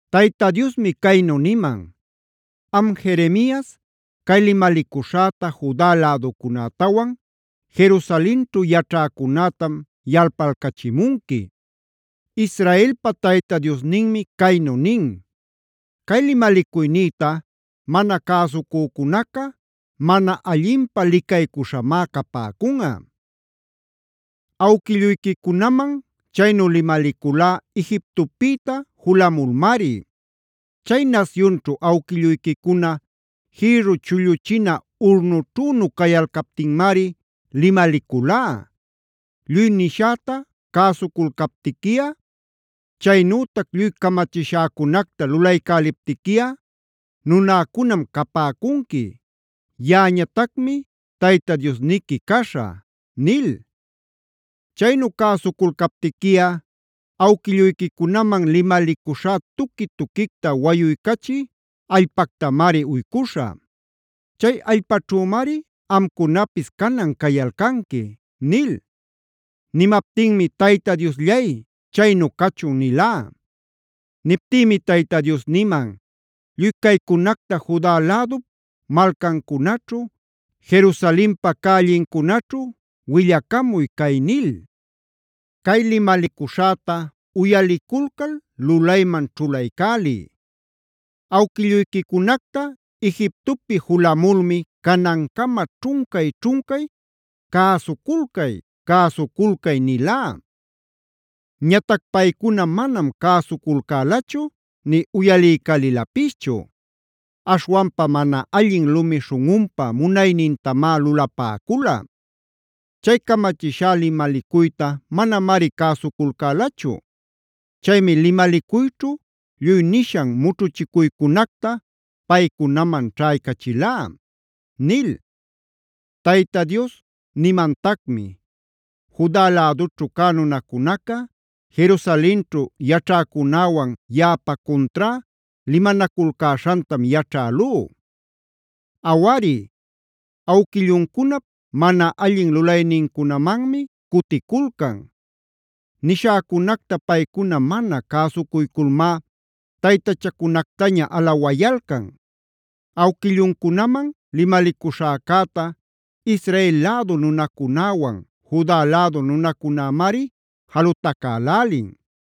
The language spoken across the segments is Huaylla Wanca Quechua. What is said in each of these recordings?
Tayta Diosmi caynu niman: “Am Jeremias, cay limalicuśhäta Juda läducunätawan Jerusalenćhu yaćhäcunätam yalpalcachimunqui. Israelpa Tayta Diosninmi caynu nin: ‘Cay limalicuynïta mana cäsucücunaca mana allinpä licaycuśhamá capäcunꞌa. Awquilluyquicunaman chaynu limaliculá Egiptopïta julamulmari. Chay nasyunćhu awquilluyquicuna jïrru chulluchina urnućhünu cayalcaptinmari limaliculá: “Lluy nishäta cäsuculcaptiquiꞌa, chaynütac lluy camachishäcunacta lulaycäliptiquiꞌa nunäcunam capäcunqui; yaꞌañatacmi Tayta Diosniqui caśhä” nil. Chaynu cäsuculcaptiquiꞌa awquilluyquicunaman limalicuśhá tuqui-tuquicta wayuycachï allpactamari uycuśhä. Chay allpaćhümari amcunapis canan cayalcanqui’” nil. Nimaptinmi: “Tayta Diosllay, chaynu cachun” nilá. Niptïmi Tayta Dios niman: “Lluy caycunacta Juda lädup malcancunaćhu, Jerusalenpa cällincunaćhu willacamuy cay nil: ‘Cay limalicuśhäta uyaliculcal lulayman ćhulaycäliy. Awquilluyquicunacta Egiptopi julamulmi canancama ćhuncay-ćhuncay “Cäsuculcay-cäsuculcay” nilá. Ñatac paycuna manam cäsuculcälachu nï uyaliycälilapischu. Aśhwanpa mana allin lumi śhunꞌunpa munaynintamá lulapäcula. Chay camachishá limalicuyta manamari cäsuculcälachu. Chaymi limalicuyćhu lluy nishan mućhuchicuycunacta paycunaman ćhaycachilá’” nil. Tayta Dios nimantacmi: “Juda lädućhu cä nunacunaca, Jerusalenćhu yaćhäcunäwan yaꞌapa cuntrá limanaculcäśhantam yaćhälú. Awari, awquilluncunap mana allin lulaynincunamanmi cuticulcan. Nishäcunacta paycuna mana cäsucuyculmá taytachacunactaña alawayalcan. Awquilluncunaman limalicuśhäcäta Israel lädu nunacunäwan Juda lädu nunacunämari jalutacälälin.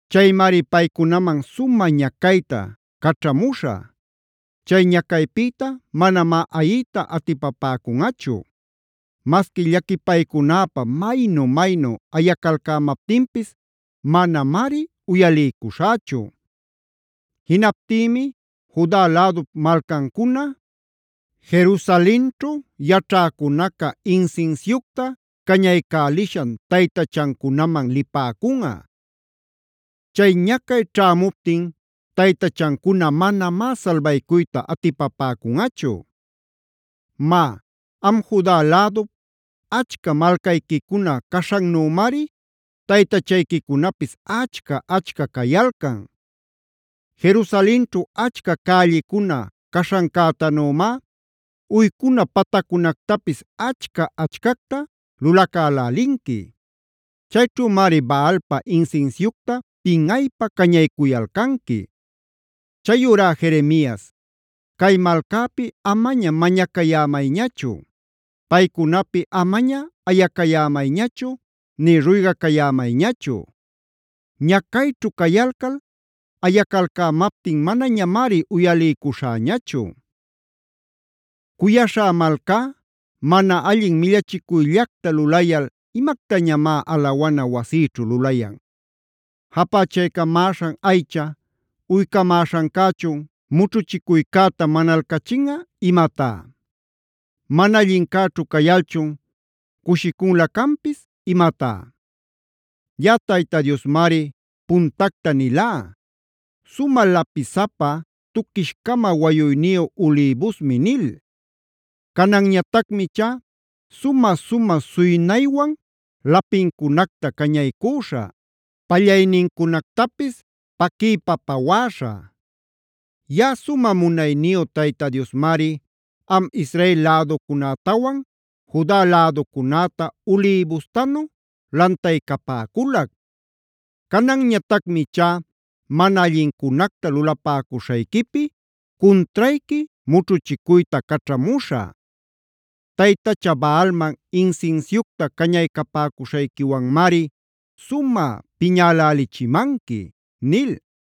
Chaymari paycunaman sumä ñacayta caćhamuśhä; chay ñacaypïta manamá ayiyta atipapäcunꞌachu. Masqui llaquipaycunäpä maynu-maynu ayacalcämaptinpis manamari uyaliycuśhächu. Jinaptïmi Juda lädup malcancuna, Jerusalenćhu yaćhäcunaca insinsiucta cañaycälishan taytachancunaman lipäcunꞌa. Chay ñacay ćhämuptin taytachancuna manamá salbaycuyta atipapäcunꞌachu. Má, am Juda lädup, achca malcayquicuna caśhannümari taytachayquicunapis achca-achca cayalcan. Jerusalenćhu achca cällicuna caśhancätanümá uycuna pataccunactapis achca-achcacta lulacälälinqui. Chayćhümari Baalpa insinsiucta pinꞌaypa cañaycuyalcanqui. “Chayurá Jeremias, cay malcäpi amaña mañacayämayñachu. Paycunapi amaña ayacayämayñachu nï ruygacayämayñachu. Ñacayćhu cayalcal ayacalcämaptin manañamari uyaliycuśhäñachu. “Cuyaśhá malcá, mana allin millachicuyllacta lulayal, ¿imactañamá alawana wasïćhu lulayan? ¿Japächaycapamäśhan aycha uycamäśhancächun mućhuchicuycäta manalcachinꞌa imatá? ¿Mana allincäćhu cayalchun cushicunlä canpis imatá? Yaꞌa Tayta Diosmari puntacta nilá: ‘Sumä lapisapa, tuquish-cama wayuyniyu ulïbusmi’ nil. Cananñatacmi ichá sumä-sumä suynaywan lapincunacta cañaycüśha; pallaynincunactapis paquiypa pawäśhä. “Yaꞌa sumä munayniyu Tayta Diosmari, am Israel läducunätawan Juda läducunäta ulïbustanu lantaycapäculac. Cananñatacmi ichá mana allincunacta lulapäcuśhayquipi cuntrayqui mućhuchicuyta caćhamuśhä. Taytacha Baalman insinsiucta cañaycapäcuśhayquiwanmari sumä piñälälichimanqui” nil.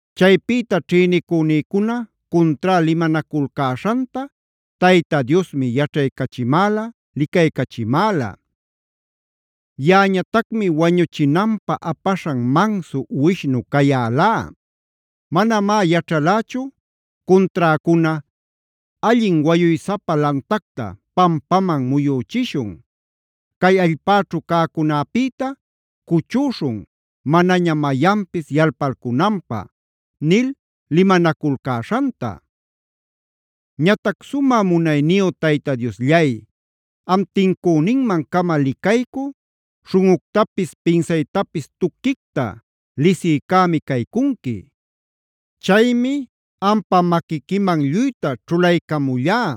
Chaypïta ćhïnicünïcuna cuntrá limanaculcäśhanta Tayta Diosmi yaćhaycachimäla, licaycachimäla. Yaꞌañatacmi wañuchinanpä apaśhan mansu uwishnu cayälá. Manamá yaćhalächu cunträcuna: “Allin wayuysapa lantacta pampaman muyüchishun. Cay allpäćhu cäcunäpïta cuchüśhun, manaña mayanpis yalpalcunanpä” nil limanaculcäśhanta. Ñatac sumä munayniyu Tayta Diosllay, am tincüninman-cama licaycü, śhunꞌuctapis pinsaytapis tuquicta lisiycämi caycunqui. Chaymi ampa maquiquiman lluyta ćhulaycamullá.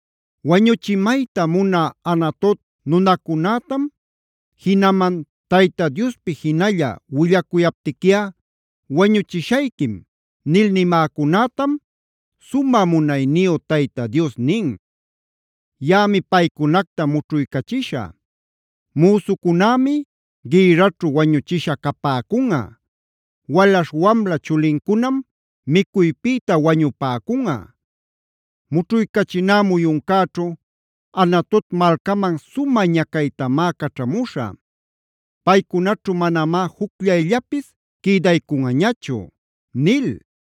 Wañuchiymayta munä Anatot nunacunätam, jinaman “Tayta Diospi jinalla willacuyaptiquiꞌa wañuchishayquim” nil nimäcunätam, sumä munayniyu Tayta Dios nin: “Yaꞌami paycunacta mućhuycachishä. Müsucunämi gïrraćhu wañuchisha capäcunꞌa. Walaśh wamla chulincunam micuypïta wañupäcunꞌa. Mućhuycachiná muyuncäćhu Anatot malcaman sumä ñacaytamá caćhamuśhä. Paycunaćhu manamá jucllayllapis quïdaycunꞌañachu” nil.